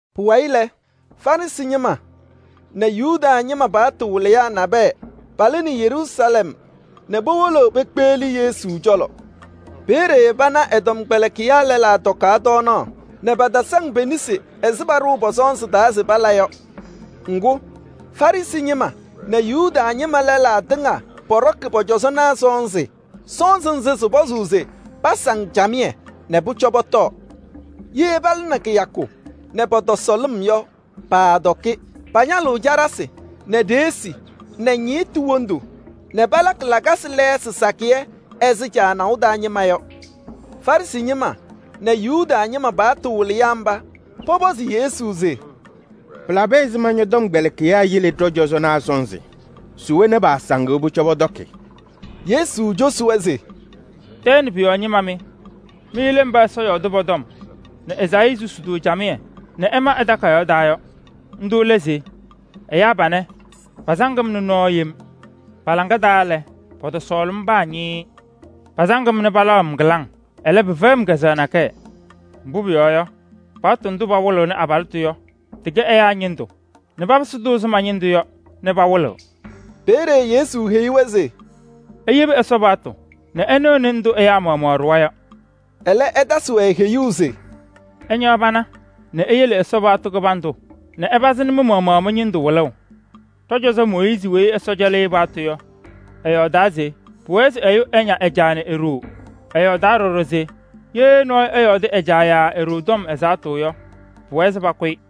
Pʋwayɩ lɛ, Farɩsɩ ñɩma nɛ Yuda ñɩma paɣtʋ wɩlɩyaa nabɛyɛ palɩnɩ Yeruusalɛm nɛ powolo pekpeɣli Yesu cɔlɔ. Peeye pana ɛ-tɔmkpɛlɩkɩyaa lɛlaa tɔkaɣ tɔɔnaɣ nɛ patasaŋ pe-nesi ɛzɩ paɖʋʋ pɔ-sɔnzɩ taa se pala yɔ. Ŋgʋ, Farɩsɩ ñɩma nɛ Yuda ñɩma lɛlaa tɩŋa pɔɖɔkɩ pɔ-cɔzɔnaa sɔnzɩ. Sɔnzɩ nzɩ sɩpɔzʋʋ se pasaŋ camɩyɛ nɛ pʋcɔ pɔtɔɔ. Ye palɩnɩ kɩyakʋ nɛ pɔtɔsɔ lɩm yɔ, paatɔkɩ. Pañalɩɣ caɖasɩ nɛ ɖeɣsi nɛ ñɩɣtʋ wondu nɛ palakɩ lakasɩ lɛɛsɩ sakɩyɛ ɛzɩ caanaʋ taa ñɩma yɔ. Farɩsɩ ñɩma nɛ Yuda ñɩma paɣtʋ wɩlɩyaa mba pɔpɔzɩ Yesu se: “Pɩlabɩ ɛzɩma ñɔ-tɔmkpɛlɩkɩyaa yele ɖɔ-cɔzɔnaa sɔnzɩ nɛ paasaŋɩɣ se pʋcɔ pɔtɔɔ?” Yesu cosi-wɛ se: “Tɛɛ nɛ pʋ-yɔɔ ñɩma mɩ! Mɩ lɛ mba Ɛsɔ yɔɔdɩ pɔ-tɔm nɛ Ezaayii susi-tʋ camɩyɛ nɛ ɛma ɛ-takayaɣ taa yɔ. Ndʋ lɛ se: ‘Ɛyaa panɛ pasaŋ-m nɛ nɔɔ yem. Pa-laŋa taa lɛ, pɔtɔsɔɔlɩ-m paa ñɩɩɩ. Pa-samtʋ fɛyɩ-m kazʋwa nakɛyɛ. Mbʋ pʋyɔɔ yɔ, pakpaɣ ɛyaa paɣtʋ nɛ papɩsɩ ɛzɩ ma-ñɩndʋ yɔ nɛ pawɩlɩɣ.’” Peeye Yesu heyi-wɛ se: “Iyebi Ɛsɔ paɣtʋ nɛ ɩnɩɣnɩ ndʋ ɛyaa maɣmaɣ ɖʋwa yɔ.” Ɛlɛ, ɛtasɩ-wɛ heyuu se: “Ɩñaɣ pana nɛ iyele Ɛsɔ paɣtʋ kɩbandʋ nɛ ɩpazɩnɩ mɩ-maɣmaɣ mɩ-ñɩndʋ wɩlʋʋ. Ɖɔ-cɔzɔ Mooyiizi weyi Ɛsɔ cɛlɩ-ɩ paɣtʋ yɔ, ɛyɔɔdaa se: ‘Pʋwɛɛ se ɛyʋ ɛña ɛ-caa nɛ e-ɖoo.’ Ɛyɔɔdaa ɖɔɖɔ se: ‘Ye nɔɔyʋ ɛyɔɔdɩ ɛ-caa yaa e-ɖoo tɔm ɛzaɣtʋ yɔ, pʋwɛɛ se pakʋ-ɩ.’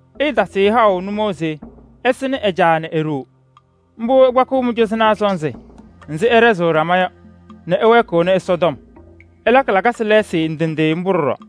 ɩɩtasɩɣ-ɩ haʋ waɖɛ se ɛsɩnɩ-wɛ. Mbʋ ɩkpakɩɣ mɩ-cɔzɔnaa sɔnzɩ nzɩ ɩɖɛzɩɣ ɖama yɔ nɛ ɩwɛɛkɩɣnɩ Ɛsɔtɔm. Ɩlakɩ lakasɩ lɛɛsɩ ndɩ ndɩ mbʋ ɖɔɖɔ.”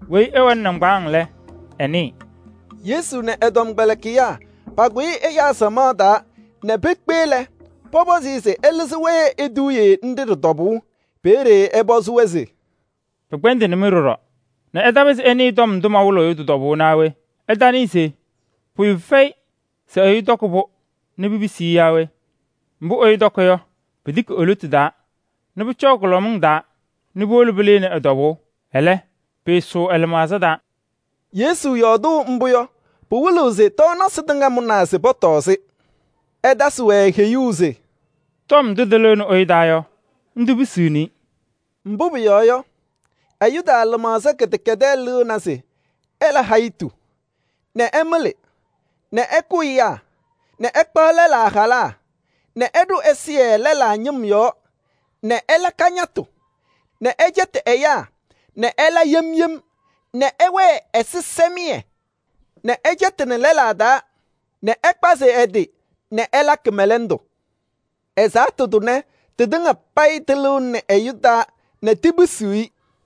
Weyi ɛwɛnɩ nɩŋgbaaŋ lɛ, ɛnɩɩ.]” Yesu nɛ ɛ-tɔmkpɛlɩkɩyaa pakʋyɩ ɛyaa samaɣ taa nɛ pekpe lɛ, pɔpɔzɩ-ɩ se ɛlɩzɩ-wɛ eduuye nɖɩ ɖɩ-tɔbʋʋ. Peeye ɛpɔzɩ-wɛ se: “Pɩkpɛndɩnɩ-mɩ ɖɔɖɔ nɛ ɩtapɩzɩ ɩnɩɩ tɔm ndʋ mɔyɔɔdʋʋ yɔ tɩ-tɔbʋʋ naa we? Ɩtanɩɩ se pʋyʋ fɛyɩ se ɛyʋ tɔkɩ-pʋ nɛ pipisi-i yaa we? Mbʋ ɛyʋ tɔkɩ yɔ, pitiki e-lotu taa nɛ pʋcɔɔ kʋlɔmɩŋ taa nɛ puwolo pɩlɩnɩ ɛ-tɔbʋʋ. Ɛlɛ, pɩɩsʋʋ ɛ-lɩmaɣza taa.” Yesu yɔɔdʋʋ mbʋ yɔ, pɩwɩlɩɣ se tɔɔnasɩ tɩŋa mʋnaa se pɔtɔɔ-sɩ. Ɛtasɩ-wɛ heyuu se: “Tɔm ndʋ tɩlɩɣnɩ ɛyʋ taa yɔ, ndʋ pisiɣni-i.” Mbʋ pʋyɔɔ yɔ, ɛyʋ taa lɩmaɣza kɩdɛkɛdɛɛ lɩɣna se ɛla hayitu nɛ ɛmɩlɩ nɛ ɛkʋ ɛyaa nɛ ɛkpaɣ lɛlaa halaa nɛ ɛɖʋ ɛzɩyɛ lɛlaa ñɩm yɔɔ nɛ ɛla kañatʋ nɛ ɛla ajiitu nɛ ɛla yem yem nɛ ɛwɛɛ ɛzɩsɛmɩyɛ nɛ ɛcɛtɩnɩ lɛlaa taa nɛ ɛkpazɩ ɛ-tɩ nɛ ɛla kɩmɛlɛndʋ. Ɛzaɣtʋ tʋnɛ tɩtɩŋa payɩ tɩlɩɣnɩnɩ ɛyʋ taa nɛ tipisiɣ-i.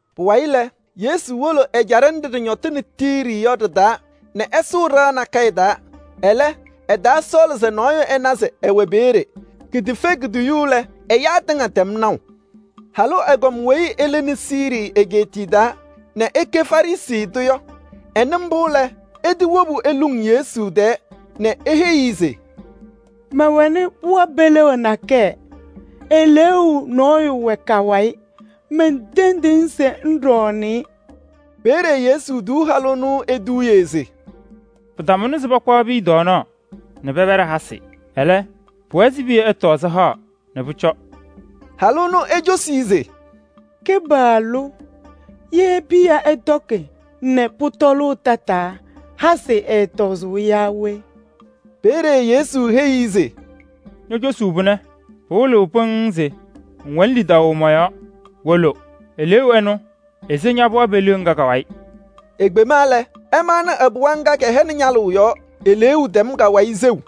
Pʋwayɩ lɛ, Yesu wolo ɛjaɖɛ nɖɩ ɖɩñɔtɩnɩ Tiiri yɔ ɖɩ-taa nɛ ɛsʋʋ ɖɩɣa nakɛyɛ taa. Ɛlɛ, ɛtaasɔɔlɩ se nɔɔyʋ ɛna se ɛwɛ peeye. Kitefe kutoyu lɛ, ɛyaa tɩŋa tɛm naʋ. Halʋ ɛgɔm weyi ɛlɩnɩ Siirii egeetiye taa nɛ ɛkɛ Fenisii tʋ yɔ, ɛnɩ mbʋ lɛ, ɛtɩwobu eluŋ Yesu tɛɛ nɛ eheyi-i se: “Mɛwɛnɩ pɩɣa peliɣa nakɛyɛ, eleeu nɔyʋ wɛ ka-wayɩ. Mentendiɣ-ŋ se ŋɖɔɔnɩ-ɩ.” Peeye Yesu tuu halʋ ɛnʋ eduuye se: “Pɩtamʋnɩ se pakpaɣ piya tɔɔnaɣ nɛ pɛpɛɖɩ hasɩ. Ɛlɛ, pʋwɛɛ se piya ɛtɔɔ sɩhaɣ nɛ pʋcɔ.” Halʋ ɛnʋ ecosi-i se: “Kɩpaɣlʋ! Ye piya ɛtɔkɩ nɛ pʋtɔʋ tataa, hasɩ ɛɛtɔzʋʋ yaa we?” Peeye Yesu heyi-i se: “Ño-cosuu pʋnɛ pɩwɩlɩɣ pɩŋŋ se ŋwɛnɩ lidaʋ mɔ-yɔɔ: wolo. Eleeu ɛnʋ ese ña-pɩɣa peliɣa ŋga ka-wayɩ.” Ekpema lɛ, ɛmaɣnɩ ɛ-pɩɣa ŋga kɛhɛnɩ ñalʋʋ yɔɔ. Eleeu tɛm ka-wayɩ seu.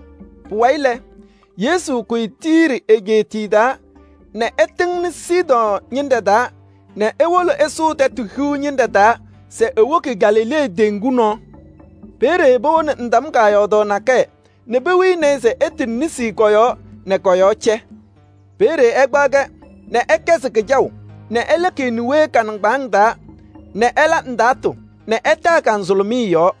Pʋwayɩ lɛ, Yesu kʋyɩ Tiiri egeetiye taa nɛ ɛtɩŋnɩ Sidɔɔ ñɩnɖɛ taa nɛ ewoko ɛsʋʋ Tɛtʋ Hiu ñɩnɖɛ taa se ewoki Galilee teŋgu nɔɔ. Peeye powoni ndam kaayɔɔdaɣ nakɛyɛ nɛ pewini-i se ɛtɩnɩ nesi kɔ-yɔɔ nɛ kɔ-yɔɔ cɛ. Peeye ɛkpaɣ-kɛ nɛ ɛkɛzɩ kɩjaʋ nɛ ɛlɛkɩ e-niwee ka-nɩŋgbaaŋ taa nɛ ɛla ndaatʋ nɛ ɛtaa ka-nzʋlʋmɩyɛ yɔɔ.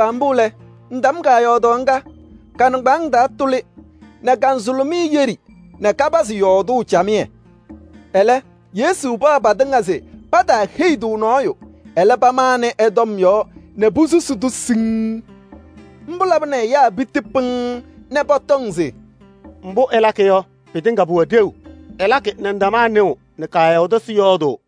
Kpaagbaa mbʋ lɛ, ndam kaayɔɔdaɣ ŋga, ka-nɩŋgbaaŋ taa tʋlɩ nɛ ka-nzʋlʋmɩyɛ yɛɖɩ nɛ kapazɩ yɔɔdʋʋ camɩyɛ. Ɛlɛ, Yesu paɣ patɩŋa se pataaheyi-tʋ nɔɔyʋ, ɛlɛ pamanɩ ɛ-tɔm yɔɔ nɛ posusi-tʋ siŋŋ. Mbʋ labɩnɩ ɛyaa piti pɩŋŋ nɛ pɔtɔŋ se: “Mbʋ ɛlakɩ yɔ, pɩtɩŋa pʋwɛ ɖeu. Ɛlakɩ nɛ ndamaa nɩɣ nɛ kaayɔɔdasɩ yɔɔdʋʋ.”